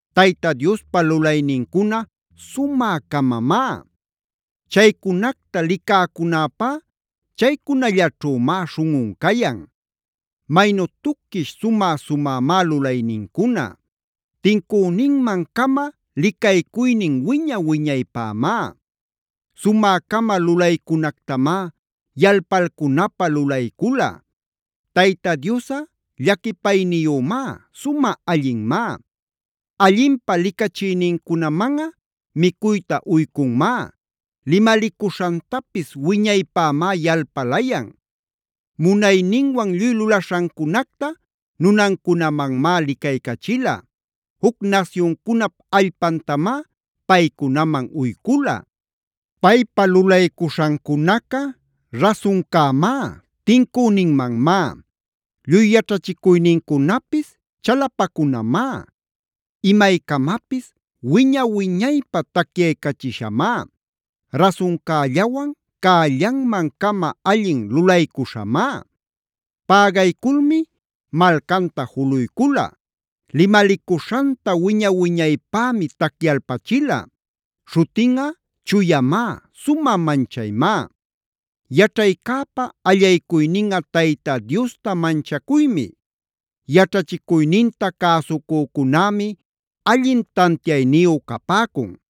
Tayta Diospa lulaynincuna sumä-camamá. Chaycunacta licäcunäpá chaycunallaćhümá śhunꞌun cayan. Maynu tuquish sumä-sumämá lulaynincuna. Tincüninman-cama licaycuynin wiña-wiñaypämá. Sumä-cama lulaycunactamá yalpalcunapä lulaycula. Tayta Diosꞌa llaquipayniyümá, sumä allinmá. Allinpä licachïnincunamanꞌa micuyta uycunmá. Limalicuśhantapis wiñaypämá yalpalayan. Munayninwan lluy lulaśhancunacta nunancunamanmá licaycachila. Juc nasyuncunap allpantamá paycunaman uycula. Paypa lulaycuśhancunaca rasuncämá, tincüninmanmá. Lluy yaćhachicuynincunapis chalapacunamá, imaycamapis wiña-wiñaypä tacyaycachishamá, rasuncällawan cällanman-cama allin lulaycuśhamá. Pägayculmi malcanta juluycula. Limalicuśhanta wiña-wiñaypämi tacyalpachila. Śhutinꞌa chuyamá, sumä manchaymá. Yaćhaycäpa allaycuyninꞌa Tayta Diosta manchacuymi. Yaćhachicuyninta cäsucücunämi allin tantiayniyu capäcun.